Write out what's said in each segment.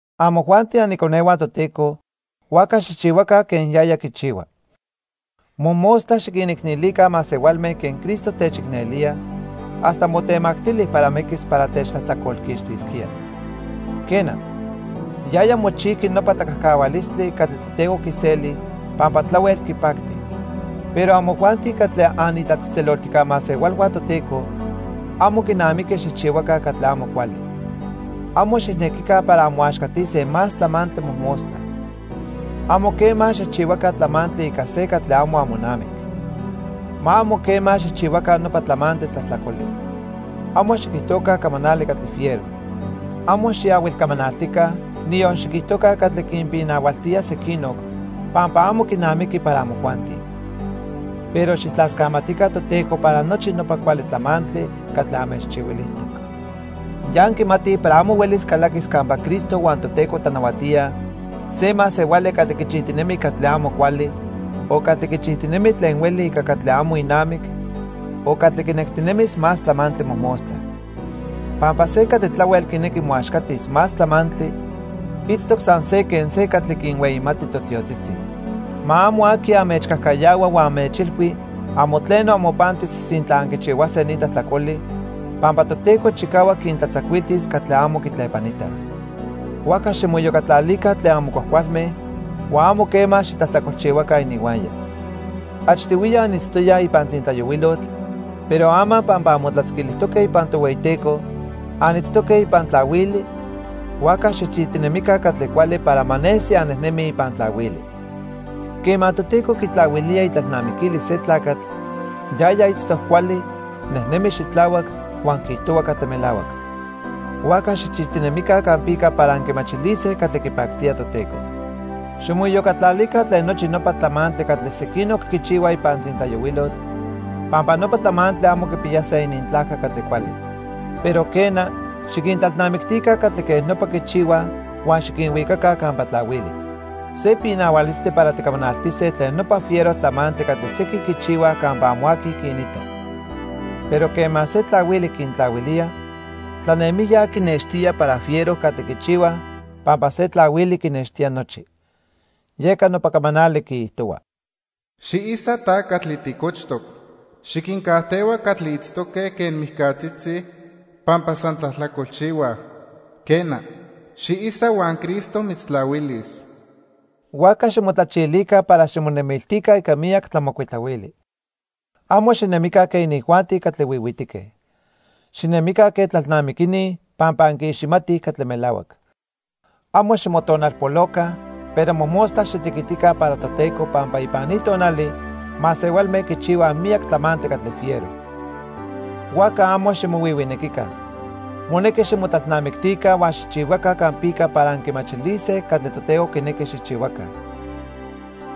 Amojuanti aniconehua Toteco, huajca xijchihuaca quen yaya quichihua. Mojmostla xiquinicnelica masehualme quen Cristo techicnelía hasta motemactili para miquis para techtlajtlacolquixtisquía. Quena, yaya mochijqui nopa tlacajcahualistli catli Toteco quiseli pampa tlahuel quipacti. Pero amojuanti catli anitlatzejtzeloltijca masehualhua Toteco, amo quinamiqui xijchihuaca catli amo cuali. Amo xijnequica para anmoaxcatise más tlamantli mojmostla. Amo quema xijchihuaca tlamantli ica se catli amo amonamic. Ma amo quema xijchihuaca nopa tlamantli tlajtlacoli. Amo xiquijtoca camanali catli fiero. Amo xiahuilcamanaltica, niyon xiquijtoca catli quinpinahualtía sequinoc pampa amo quinamiqui para amojuanti. Pero xijtlascamatica Toteco para nochi nopa cuali tlamantli catli anmechchihuilijtoc. Ya anquimatij para amo huelis calaquis campa Cristo huan Toteco tlanahuatíaj se masehuali catli quichijtinemi catli amo cuali, o catli quichijtinemi tlen hueli ica catli amo inamic, o catli quinectinemis más tlamantli mojmostla. Pampa se catli tlahuel quinequi moaxcatis más tlamantli, itztoc san se quen se catli quinhueyimati totiotzitzi. Ma amo aqui anmechcajcayahua huan anmechilhui amo tleno amopantis sintla anquichihuase ni tlajtlacoli, pampa Toteco chicahuac quintlatzacuiltis catli amo quitlepanitaj. Huajca ximoiyocatlalica tlen amo cuajcualme huan amo quema xitlajtlacolchihuaca ininhuaya. Achtihuiya anitztoyaj ipan tzintlayohuilotl, pero ama pampa anmotlatzquilijtoque ipan Tohueyiteco, anitztoque ipan tlahuili, huajca xijchijtinemica catli cuali para ma nesi annejnemij ipan tlahuili. Quema Toteco quitlahuilía itlalnamiquilis se tlacatl, yaya itztoc cuali, nejnemi xitlahuac, huan quiijtohua catli melahuac. Huajca xijchijtinemica campica para anquimachilise catli quipactía Toteco. Ximoiyocatlalica tlen nochi nopa tlamantli catli sequinoc quichihuaj ipan tzintlayohuilotl pampa nopa tlamantli amo quipiyase inintlajca catli cuali. Pero quena, xiquintlalnamictica catli quej nopa quichihuaj huan xiquinhuicaca campa tlahuili. Se pinahualistli para ticamanaltise tlen nopa fiero tlamantli catli sequin quichihuaj campa amo aqui quinita. Pero quema se tlahuili quintlahuilía, tlanemijya quinextía para fiero catli quichihuaj pampa se tlahuili quinextía nochi. Yeca nopa camanali quiijtohua: "Xiisa ta catli ticochtoc. Xiquincajtehua catli itztoque quen mijcatzitzi pampa san tlajtlacolchihuaj. Quena, xiisa huan Cristo mitztlahuilis." Huajca ximotlachilica para ximonemiltica ica miyac tlamocuitlahuili. Amo xinemica quen inijuanti catli huihuitique. Xinemica quen tlalnamiquini pampa anquiiximatij catli melahuac. Amo ximotonalpoloca, pero mojmostla xitequitica para Toteco pampa ipan ni tonali masehualme quichihuaj miyac tlamantli catli fiero. Huajca amo ximohuihuinequica. Monequi ximotlalnamictica huan xijchihuaca campica para anquimachilise catli Toteco quinequi xijchihuaca.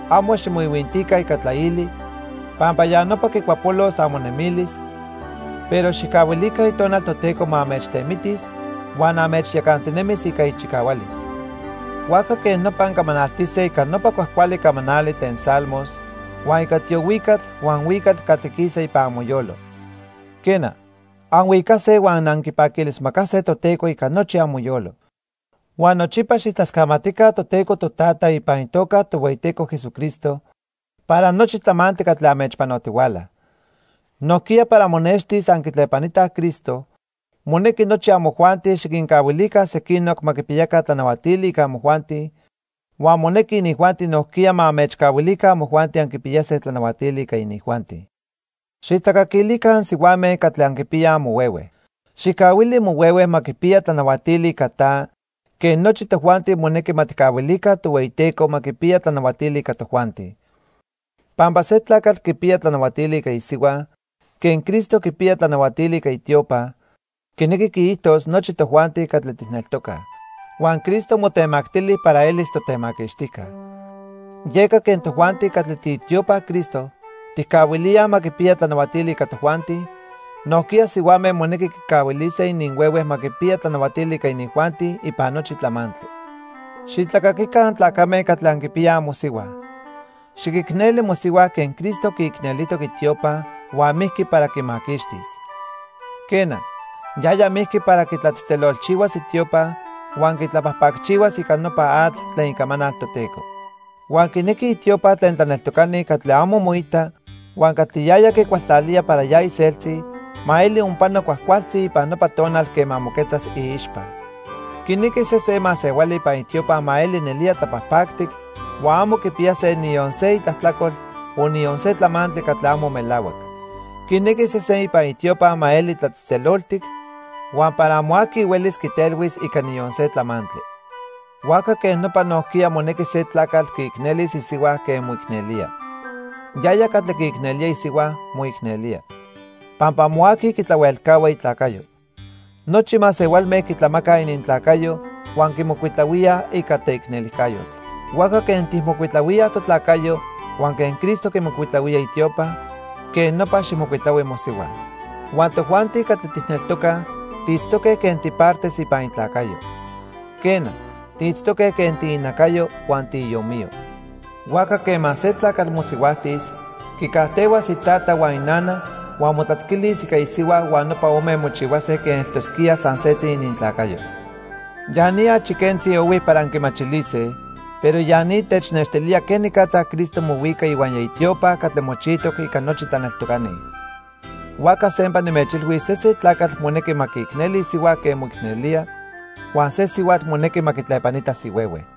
Amo ximoihuintica ica tlaili pampa ya nopa quicuapolos amonemilis, pero xijcahuilica Itonal Toteco ma anmechtemitis huan anmechyacantinemis ica ichicahualis. Huajca quej nopa ancamanaltise ica nopa cuajcuali camanali tlen Salmos, huan ica tiohuicatl huan huicatl catli quisa ipan amoyolo. Quena, anhuicase huan anquipaquilismacase Toteco ica nochi amoyolo. Huan nochipa xijtlascamatica Toteco Totata ipan itoca Tohueyiteco Jesucristo para nochi tlamantli catli anmechpanotihuala. Nojquiya para monextis anquitlepanitaj Cristo, monequi nochi amojuanti xiquincahuilica sequinoc ma quipiyaca tlanahuatili ica amojuanti huan monequi inijuanti nojquiya ma anmechcahuilica amojuanti anquipiyase tlanahuatili ica inijuanti. Xijtlacaquilica ansihuame catli anquipiyaj amohuehue. Xijcahuili mohuehue ma quipiya tlanahuatili ica ta quen nochi tojuanti monequi ma tijcahuilica Tohueyiteco ma quipiya tlanahuatili ica tojuanti. Pampa se tlacatl quipiya tlanahuatili ica isihua quen Cristo quipiya tlanahuatili ica itiopa, quinequi quiijtos nochi tojuanti catli tijneltocaj. Huan Cristo motemactili para elis totemaquixtijca. Yeca quen tojuanti catli tiitiopa Cristo tijcahuilíaj ma quipiya tlanahuatili ica tojuanti, nojquiya sihuame monequi quicahuilise ininhuehue ma quipiya tlanahuatili ica inijuanti ipan nochi tlamantli. Xitlacaquica antlacame catli anquipiyaj amosihua. Xiquicneli mosihua quen Cristo quiicnelijtoc itiopa huan mijqui para quimaquixtis. Quena, yaya mijqui para quitlatzejtzelolchihuas itiopa huan quitlapajpacchihuas ica nopa atl tlen icamanal Toteco. Huan quinequi itiopa tlen tlaneltocani catli amo moita huan catli yaya quicualtlalía para ya iseltzi, ma eli onpano cuajcualtzi ipan nopa tonal quema moquetzas iixpa. Quinequi sesen masehuali ipan itiopa ma eli nelía tlapajpactic huan amo quipiyase niyon se itlajtlacol o niyon se tlamantli catli amo melahuac. Quinequi sesen ipan itiopa ma eli tlatzejtzeloltic huan para amo aqui huelis quitelhuis ica niyon se tlamantli. Huajca quej nopa nojquiya monequi se tlacatl quiicnelis isihua quen moicnelía. Yaya catli quiicnelía isihua, moicnelía. Pampa amo aqui quitlahuelcahua itlacayo. Nochi masehualme quitlamacaj inintlacayo huan quimocuitlahuíaj ica teicnelijcayotl. Huajca quen tijmocuitlahuíaj totlacayo huan quen Cristo quimocuitlahuía itiopa, quen nopa xijmocuitlahui mosihua. Huan tojuanti catli tijneltocaj tiitztoque quen tipartes ipan itlacayo. Quena, tiitztoque quen tiinacayo huan tiiomiyo. Huajca quema se tlacatl mosihuajtis, quicajtehuas itata huan inana huan motlatzquilis ica isihua huan nopa ome mochihuase quen eltosquía san setzi inintlacayo. Ya ni achi quentzi ohui para anquimachilise pero ya ni technextilía quenicatza Cristo mohuica ihuaya itiopa catli mochijtoc ica nochi tlaneltocani. Huajca sempa nimechilhuis sesen tlacatl monequi ma quiicneli isihua quen moicnelía, huan se sihuatl monequi ma quitlepanitas ihuehue.